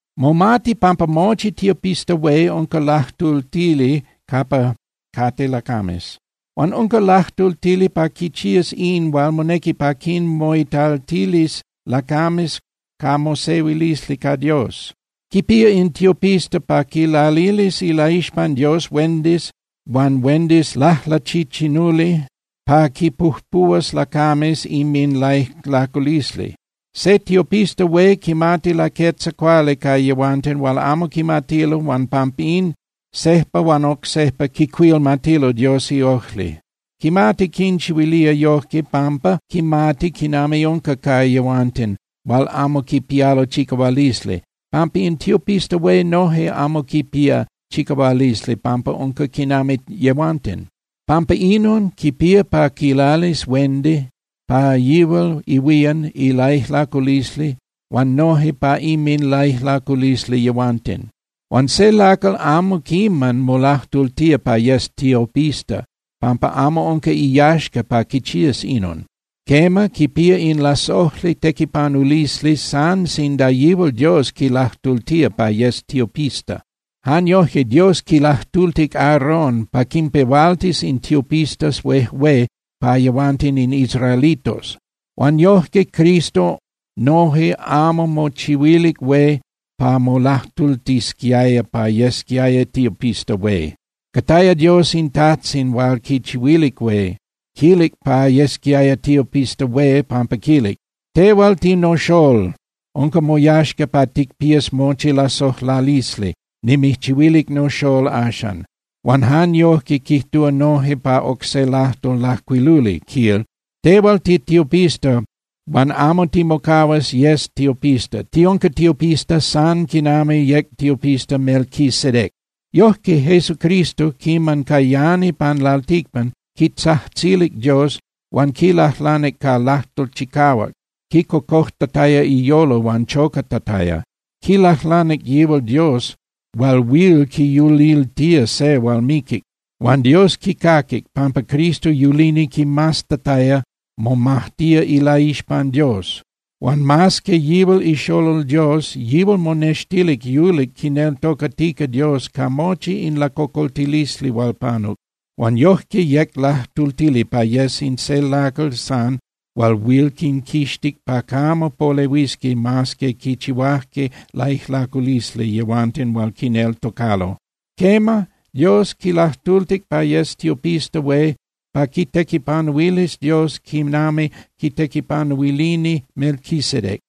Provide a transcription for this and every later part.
Momati pampa mochi tiopista hué unca lajtultili capa cate lacames. Huan unca lajtultili pa quichías in hual monequi pa quinmoitaltilis lacames ca mosehuilisli ca Dios. Quipía in tiopista pa quinlalilis ilaixpan Dios huendis huan huendis lajlachichinuli pa quinpujpuhuas lacames inminlaijlaculisli. Se tiopista hué quimati laquetza cuali ca yehuanten hual amo quimatilo huan pampín sejpa huan oc sejpa quicuilmatilo Dios iojli. Quimati quinchihuilía yojque pampa quimati quinami unca ca yehuanten hual amo quipialo chicahualisli, pampa in tiopista hué noje amo quipía chicahualisli pampa unca quinami yehuanten. Pampa inon, quipía pa quilalis huendi pa yihual ihuían ilaijlaculisli huan noje pa inminlaijlaculisli yehuanten. Huan se lacal amo quiman molajtultía pa yes tiopista, pampa amo unca iyaxca pa quichías inon. Quema, quipía in lasojli tequipanulisli san sinda yihual Dios quilajtultía pa yes tiopista. Jan yojque Dios quilajtultic Aaron pa quinpehualtis in tiopistas huejué pa yehuanten in israelitos. Huan yojque Cristo noje amo mochihuilic hué pa molajtultisquiaya pa yesquiaya tiopista hué. Cataya Dios in Tajtzin hual quichihuilic hué, quilic pa yesquiaya tiopista hué, pampa quilic: Tehual tinoXolol, unca moyaxca pa ticpías mochi lasojlalisli, nimijchihuilic noXolol axcan. Huan jan yojque quijtúa noje pa oc se lajtol lajcuiluli, quil: Tehual titiopista huan amo timocahuas tiyes tiopista. Tiunca tiopista san quinami yec tiopista Melquisedec. Yojque, Jesucristo, quiman cayani pan lalticpan, quitzajtzilic Dios huan quilajlanic ca lajtol chicahuac, quicocojtataya iyolo huan chocatataya. Quilajlanic yihual Dios hual huil quiyuliltía se hual miquic. Huan Dios quicaquic, pampa Cristo yulini quimaztataya momajtía ilaixpan Dios. Huan mas que yihual iXolol Dios, yihual monextilic yulic quineltocatica Dios ca mochi in lacocoltilisli hual panuc. Huan yojque yec lajtultili pa yes in se lacal san hual huil quinquixtic pa camo polehuisqui mas que quichihuajque laijlaculisli yehuanten hual quineltocalo. Quema, Dios quilajtultic pa yes tiopista hué pa quitequipanuilis Dios quinami quitequipanuilini Melquisedec.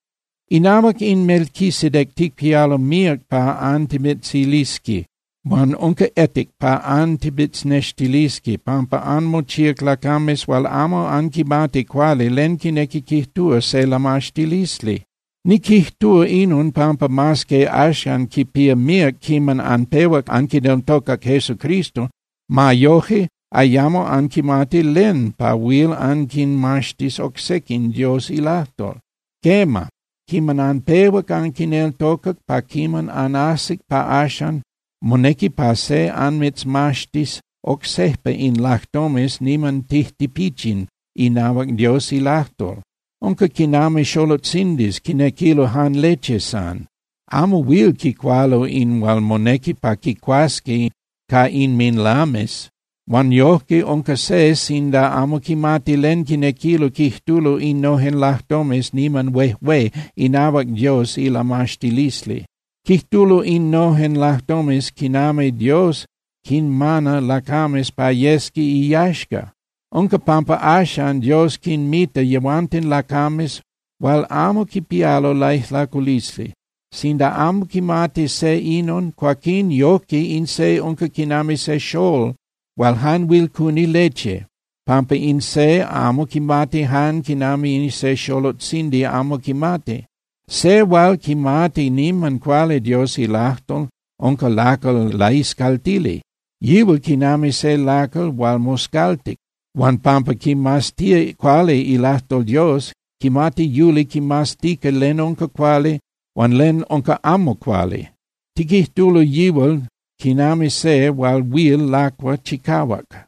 Inahuac in Melquisedec ticpialo míac pa antimitzilisqui huan unca etic pa antimitznextilisqui, pampa anmochíac lacames hual amo anquimati cuali len quinequi quijtúa se lamaxtilisli. Niquijtúa inon, pampa mas que axan quipía míac quiman anpehuac anquineltocac Jesucristo, ma yoje, ayamo anquimati len pa huil anquinmaxtis oc sequin Dios ilajtol. Quema, quiman anpehuac anquineltocac pa quiman anajsic pa axan, monequi pa se anmitzmaxtis oc sejpa in lajtomes niman tijtipichin inahuac Dios ilajtol. Unca quinami xolotzindis quinequilo jan leche san, amo huil quicualo in hual monequi pa quicuasqui ca inminlames. Huan yojque unca se sinda amo quimati len quinequilo quijtulo innojen lajtomes niman huejué inahuac Dios ilamaxtilisli. Quijtulo innojen lajtomes quinami Dios quinmana lacames pa yesqui iyaxca. Unca pampa axan Dios quinmita yehuanten lacames hual amo quipialo laijlaculisli. Sinda amo quimati se inon, cuaquín yojque in se unca quinami se xolol hual jan huil cuni leche, pampa in se amo quimati jan quinami se xolotzindi amo quimati. Se hual quimati niman cuali Dios ilajtol unca lacal laiscaltili, yihual quinami se lacal hual moscaltic. Huan pampa quimaztía cuali ilajtol Dios, quimati yuli quimaztica len unca cuali huan len unca amo cuali. Tiquijtulo yihual quinami se hual huil lacua chicahuac.